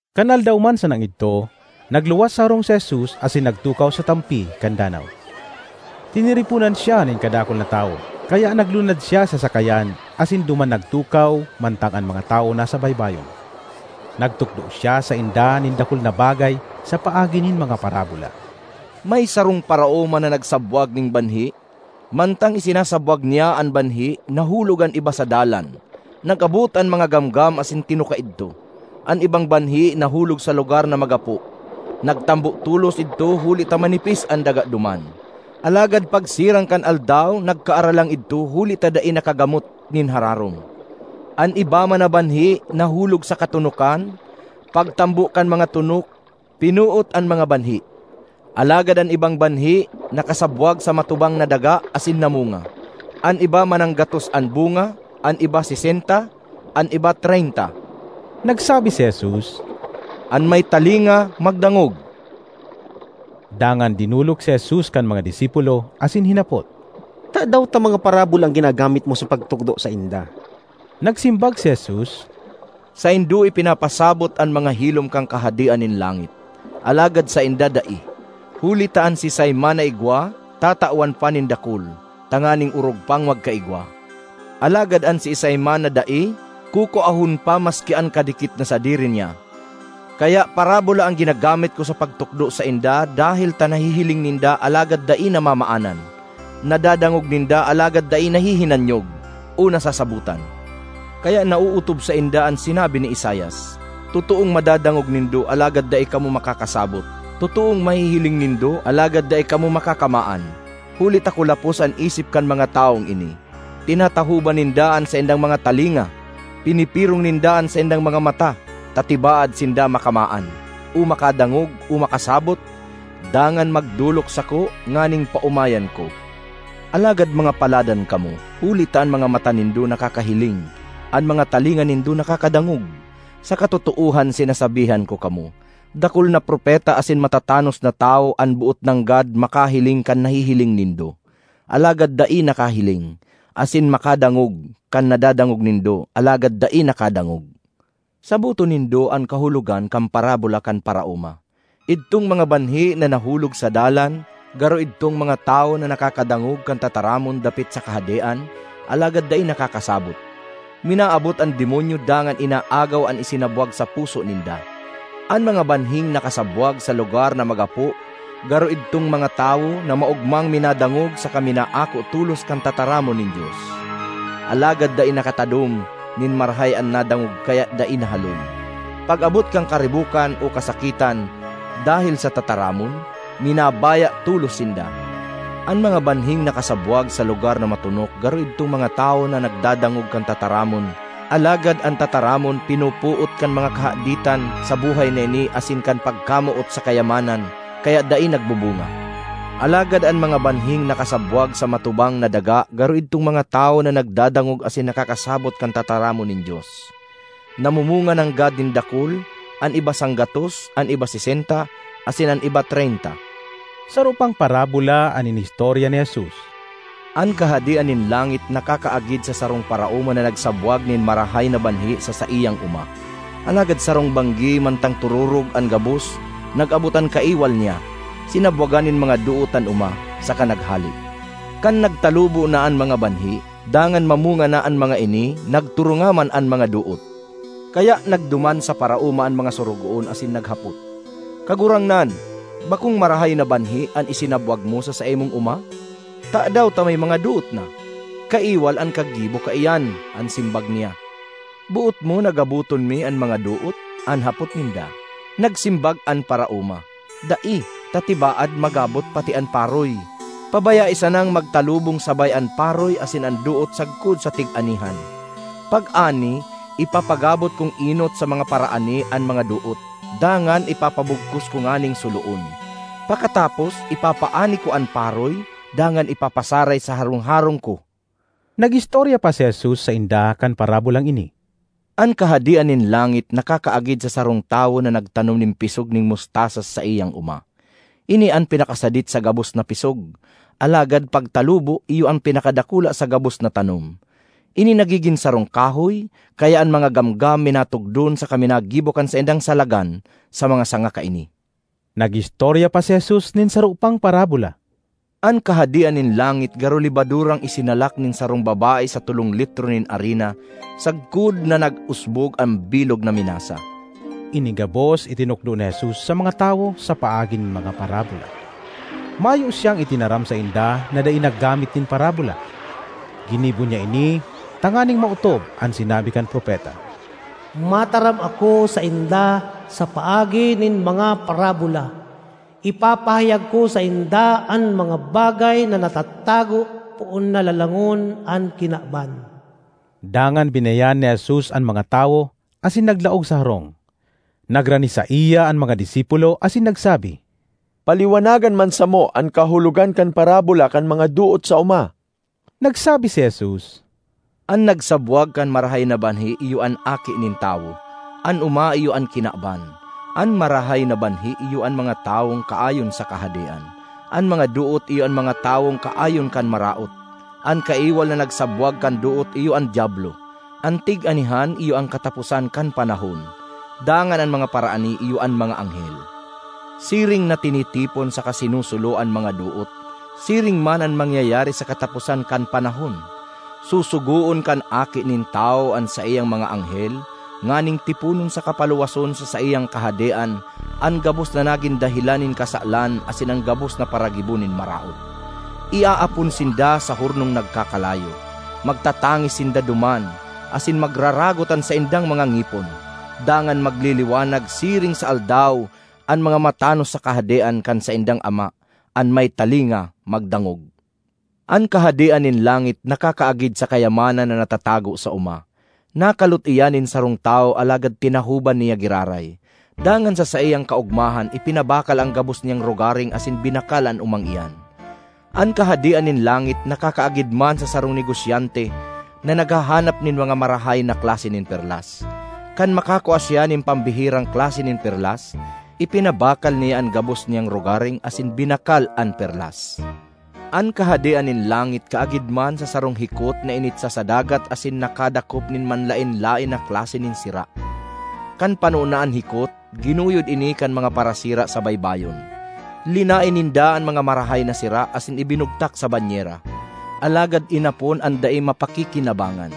Kan aldaw man sanang idto, nagluwas sa harong si Jesus asin nagtukaw sa tampi kan danaw. Tiniriponan siya nin kadakul na tawo kaya naglunad siya sa sakayan asin duman nagtukaw mantang an mga tawo nasa baybayon. Nagtukdo siya sainda nin dakul na bagay sa paagi nin mga parabola. “May sarong paraoma na nagsabwag nin banhi. Mantang isinasabwag niya an banhi, nahulog an iba sa dalan; nag-abot an mga gamgam asin tinuka idto. An ibang banhi nahulog sa lugar na magapo; nagtambo tolos idto huli ta manipis an daga duman. Alagad pagsirang kan aldaw nagkaaralang idto huli ta dai nakagamot nin hararom. An iba man na banhi nahulog sa katonokan; pagtambo kan mga tonok, pinoot an mga banhi. Alagad an ibang banhi nakasabwag sa matubang na daga asin namunga: an iba mananggatos an bunga, an iba sesenta, an iba treynta.” Nagsabi si Jesus, “An may talinga, magdangog!” Dangan dinolok si Jesus kan mga disipulo asin hinapot, “Tadaw ta mga parabola an ginagamit mo sa pagtukdo sainda?” Nagsimbag si Jesus, “Saindo ipinapasabot an mga hilom kan Kahadean nin langit, alagad sainda dai. Huli ta an siisay man na igwa, tatawan pa nin dakul, tanganing orog pang magkaigwa. Alagad an siisay man na dai, kukuahon pa maski an kadikit na sadiri niya. Kaya parabola an ginagamit ko sa pagtukdo sainda dahel ta nahihiling ninda alagad dai namamaanan, nadadangog ninda alagad dai nahihinanyog o nasasabotan. Kaya naootob sainda an sinabi ni Isaias: ‘Totoong madadangog nindo, alagad dai kamo makakasabot; totoong mahihiling nindo, alagad dai kamo makakamaan, huli ta kulapos an isip kan mga tawong ini; tinatahoban ninda an saindang mga talinga, pinipirong ninda an saindang mga mata, ta tibaad sinda makamaan, o makadangog, o makasabot, dangan magdolok sako nganing paomayan ko.’ ”Alagad mga paladan kamo, huli ta an mga mata nindo nakakahiling; an mga talinga nindo nakakadangog! Sa katotoohan sinasabihan ko kamo, dakul na propeta asin matatanos na tawo an boot nanggad makahiling kan nahihiling nindo, alagad dai nakahiling; asin makadangog kan nadadangog nindo alagad dai nakadangog. ”Saboton nindo an kahulogan kan parabola kan paraoma. Idtong mga banhi na nahulog sa dalan garo idtong mga tawo na nakakadangog kan tataramon dapit sa Kahadean alagad dai nakakasabot. Minaabot an demonyo dangan inaagaw an isinabwag sa puso ninda. An mga banhing nakasabwag sa lugar na magapo garo idtong mga tawo na maogmang minadangog saka minaako tolos kan tataramon nin Dios. Alagad dai nakatadom nin marahay an nadangog kaya dai nahaloy; pag-abot kan karibokan o kasakitan dahel sa tataramon, minabaya tolos sinda. An mga banhing nakasabwag sa lugar na matonok garo idtong mga tawo na nagdadangog kan tataramon, alagad an tataramon pinopoot kan mga kahaditan sa buhay na ini asin kan pagkamoot sa kayamanan, kaya dai nagbubunga. Alagad an mga banhing nakasabwag sa matubang na daga garo idtong mga tawo na nagdadangog asin nakakasabot kan tataramon nin Dios; namumunga nanggad nin dakul, an iba sanggatos, an iba sesenta asin an iba treynta.” Saro pang parabola an inistorya ni Jesus, “An Kahadean nin langit nakakaagid sa sarong paraoma na nagsabwag nin marahay na banhi sa saiyang oma. Alagad sarong banggi mantang tororog an gabos, nag-abot an kaiwal niya, sinabwagan nin mga doot an oma, saka naghale. Kan nagtalubo na an mga banhi, dangan mamunga na an mga ini, nagturunga man an mga doot. Kaya nagduman sa paraoma an mga sorogoon asin naghapot, ‘Kagurangnan, bakong marahay na banhi an isinabwag mo sa saimong oma? Tadaw ta may mga doot na?’ ‘Kaiwal an kaggibo kaiya,’ (kaiyan) an simbag niya. ‘Boot mo na gaboton mi an mga doot?’ an hapot ninda. Nagsimbag an paraoma, ‘Dai, ta tibaad magabot pati an paroy. Pabayae sanang magtalubong sabay an paroy asin an doot sagkod sa tig-anihan. Pag-ani, ipapagabot kong enot sa mga paraani an mga doot, dangan ipapabugkos ko nganing suloon. Pakatapos, ipapaani ko an paroy, dangan ipapasaray sa harong-harong ko.’” Nag-istorya pa si Jesus sainda kan parabolang ini, “An Kahadean nin langit nakakaagid sa sarong tawo na nagtanom nin pisog nin mustasa sa saiyang oma. Ini an pinakasadit sa gabos na pisog, alagad pagtalubo, iyo an pinakadakula sa gabos na tanom. Ini nagigin sarong kahoy, kaya an mga gamgam minatugdon saka minagibo kan saindang salagan sa mga sanga kaini.” Nag-istorya pa si Jesus nin saro pang parabola, “An Kahadean nin langit garo lebadurang isinalak nin sarong babae sa tolong litro nin arina sagkod na nag-usbog an bilog na minasa.” Ini gabos itinukdo ni Jesus sa mga tawo sa paagi nin mga parabola. Mayo siyang itinaram sainda na dai naggamit nin parabola. Ginibo niya ini tanganing maotob an sinabi kan propeta, “Mataram ako sainda sa paagi nin mga parabola; ipapahayag ko sainda an mga bagay na natatago poon na lalangon an kinaban.” Dangan binayaan ni Jesus an mga tawo asin naglaog sa harong. Nagrani saiya an mga disipulo asin nagsabi, “Paliwanagan man samo an kahulogan kan parabola kan mga doot sa oma.” Nagsabi si Jesus, “An nagsabwag kan marahay na banhi iyo an Aki nin Tawo; an oma iyo an kinaban. An marahay na banhi iyo an mga tawong kaayon sa Kahadean; an mga doot iyo an mga tawong kaayon kan Maraot. An kaiwal na nagsabwag kan doot iyo an Diablo. An tig-anihan iyo an kataposan kan panahon, dangan an mga paraani iyo an mga anghel. Siring na tinitipon saka sinusulo an mga doot, siring man an mangyayari sa kataposan kan panahon: susugoon kan Aki nin Tawo an saiyang mga anghel nganing tiponon saka paluwason sa saiyang Kahadean an gabos na nagin dahelan nin kasalan asin an gabos na paragibo nin maraot. Iaapon sinda sa hornong nagkakalayo; magtatangis sinda duman, asin magraragot an saindang mga ngipon. Dangan magliliwanag siring sa aldaw an mga matanos sa Kahadean kan saindang Ama. An may talinga, magdangog! ”An Kahadean nin langit nakakaagid sa kayamanan na natatago sa oma. Nakalot iyan nin sarong tawo alagad tinahoban niya giraray. Dangan sa saiyang kaogmahan ipinabakal an gabos niyang rogaring asin binakal an omang iyan. ”An Kahadean nin langit nakakaagid man sa sarong negosyante na naghahanap nin mga marahay na klase nin perlas. Kan makakua siya nin pambihirang klase nin perlas, ipinabakal niya an gabos niyang rogaring asin binakal an perlas. ”An Kahadean nin langit kaagid man sa sarong hikot na initsa sa dagat asin nakadakop nin manlaen-laen na klase nin sira. Kan pano na an hikot, ginuyod ini kan mga parasira sa baybayon. Linaen ninda an mga marahay na sira asin ibinugtak sa banyera; alagad inapon an dai mapakikinabangan.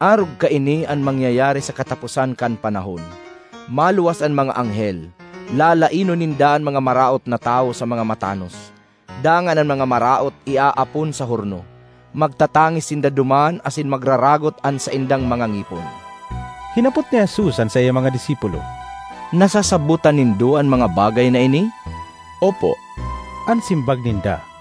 Arog kaini an mangyayari sa kataposan kan panahon: maluwas an mga anghel, lalaenon ninda an mga maraot na tawo sa mga matanos, dangan an mga maraot iaapon sa horno. Magtatangis sinda duman asin magraragot an saindang mga ngipon.” Hinapot ni Jesus an saiyang mga disipulo, “Nasasabotan nindo an mga bagay na ini?” “Opo,” an simbag ninda.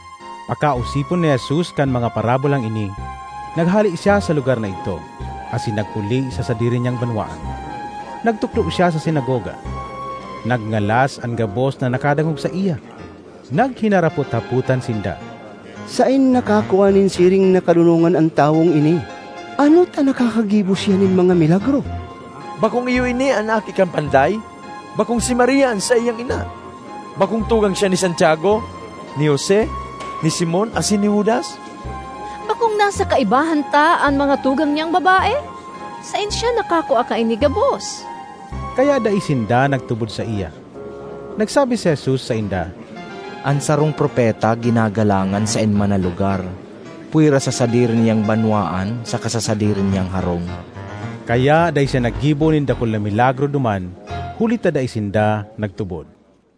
Pakaosipon ni Jesus kan mga parabolang ini, naghale siya sa lugar na idto asin nagpuli sa sadiri niyang banwaan. Nagtukdo siya sa sinagoga; nagngalas an gabos na nakadangog saiya. Naghinarapot-hapotan sinda, “Saen nakakua nin siring na kadonongan an tawong ini? Ano ta nakakagibo siya nin mga milagro? Bakong iyo ini an aki kan panday? Bakong si Maria an saiyang ina? Bakong tugang siya ni Santiago, ni Jose, ni Simon asin ni Judas? Bakong nasa kaibahan ta an mga tugang niyang babae? Saen siya nakakua kaini gabos?” Kaya dai sinda nagtubod saiya. Nagsabi si Jesus sainda, “An sarong propeta ginagalangan saen man na lugar pwera sa sadiri niyang banwaan saka sa sadiri niyang harong.” Kaya dai siya naggibo nin dakul na milagro duman huli ta dai sinda nagtubod.